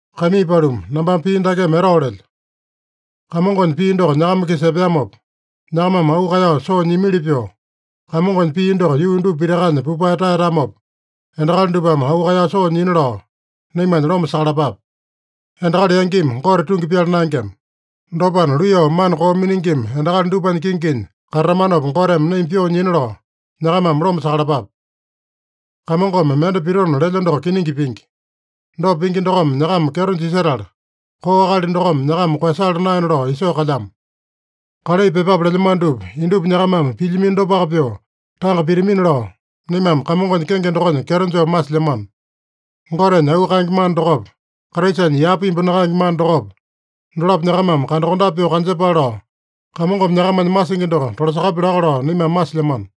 Kaimii paluma, nambame pii dakeme etao lelyo: Kamongonya pii doko nyakama-kisa epeamopa, nyakamame auu kaeyao soo nyiamili pyoo, Kamongonya pii doko yuu dupa pitakanya pupae taeyatamopa, endakali dupame auu kaeyao soo nyina lao, naimanya loma sakalapape. Endakali yangimi Gote tungi pyala naengema. Dopana, luiyao mana koo miningima endakali dupanya kinginya katatamanopa Goteme naima pyoo nyina lao, nyakamame loma sakalapape. Kamongome mende pitona lelya doko kiningi pingi. Dopa pingi dokome nyakama kyeto jisetala, koo akali dokome nyakama koeyasala naena lao isoo kalyamo. Kalai pyepape lelyamano dupa indupa nyakamame pilyamino dopaka pyoo tanga pitamina lao, naimame Kamongonya kenge dokonya kyeto joo masilyamano. Gotenya auu kaenge mana dokopa, Kraisanya yapa imbu nakaenge mana dokopa, dolapo nyakamame kandakondape pyoo kanjepale lao, Kamongome nyakamanya masingi doko tolasakapya laka lao naimame masilyamano.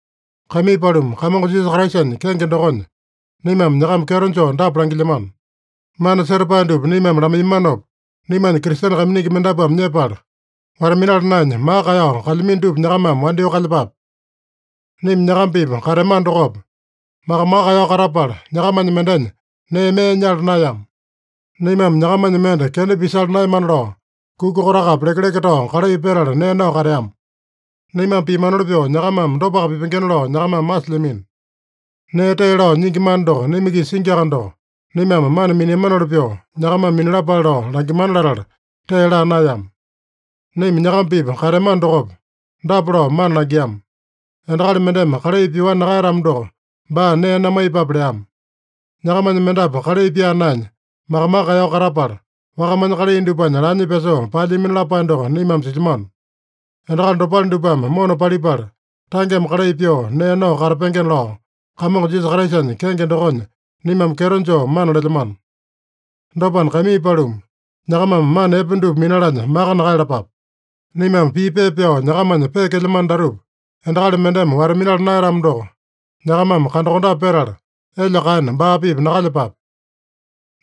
Kaimii paluma, Kamongo Jisasa Kraisanya kenge dokonya, naimame nyakama kyeto joo dapa langilyamano: Mana setapae dupa naimame lamaiyamanopa naimanya Kristene kaiminingi mendapuame nyepala, wata-minala naenya, maka kaeyao kalyamino dupa nyakamame wandyoo kalyepape. Naima nyakama-pipa kateamano dokopa, maka-maka kaeyao katapala, nyakamanya mendenya nee mee nyala naeyama. Naimame nyakamanya mende kenda pisala naeyamana lao, kuka kotakapi lekeleke tao kalai petala nee nao kateama. Naimame piamanoli pyoo nyakamame dopaka pipengena lao nyakamame masilyamino. Nee tee lao nyingi mana doko naima-kisa singiaka doko, naimame mana miniamanoli pyoo, nyakamame minalapale lao langimana latala tee laa naeyama. Naima nyakama-pipa kateamano dokopa, dapa lao mana langiama: Endakali mendeme kalai pyoani nakaeyatamo doko, baa nee namaiyepape leama. Nyakamanya mendapu kalai pyaa naenya, maka-maka kaeyao katapala, wakamanya kalai dupanya laanya pyasoo paelyamino lapae doko naimame silyamano. Endakali dopale dupame mona palipala, tangeme kalai pyoo nee nao katapengena lao, Kamongo Jisasa Kraisanya kenge dokonya naimame kyeto joo mana lelyamano. Dopana, kaimii paluma, nyakamame mana epe dupa minalanya maka nakaeyalapape. Naimame pii pepa pyao nyakamanya peekelyamano datupa endakali mendeme wata-minala naeyatamo doko, nyakamame kandakondape petala, elya kaena baa-pipa nakalyepape.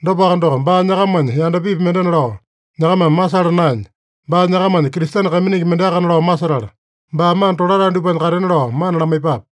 Dopaka doko, baa nyakamanya yandapipi mendena lao nyakamame masala naenya, baa nyakamanya Kristene kaiminingi mendeakana lao masetala, baa mana tolatae dupanya katena lao mana lamaiyepape.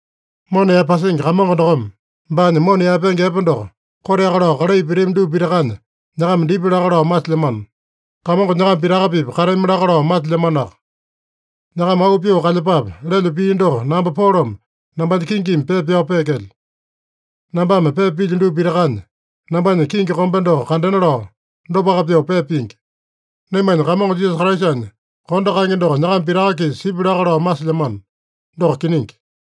Mona yaepasingi Kamongo dokome, baanya mona yaepenge epe doko koteaka lao kalai pitami dupa pitakanya, nyakama dipya laka lao masilyamano. Kamongo nyakama pitaka-pipa katami laka lao masilyamanoaka. “Nyakama auu pyoo kalyepape” lelyo pii doko namba Polome nambanya kingimi pepa pyao peekelyo. Nambame pepa pilyo dupa pitakanya, nambanya kingi kombe doko kandena lao, dopaka pyoo pepa pingi. Naimanya Kamongo Jisasa Kraisanya kondo kaenge doko nyakama pitaka-kisa sipya laka lao masilyamano. Doko kiningi.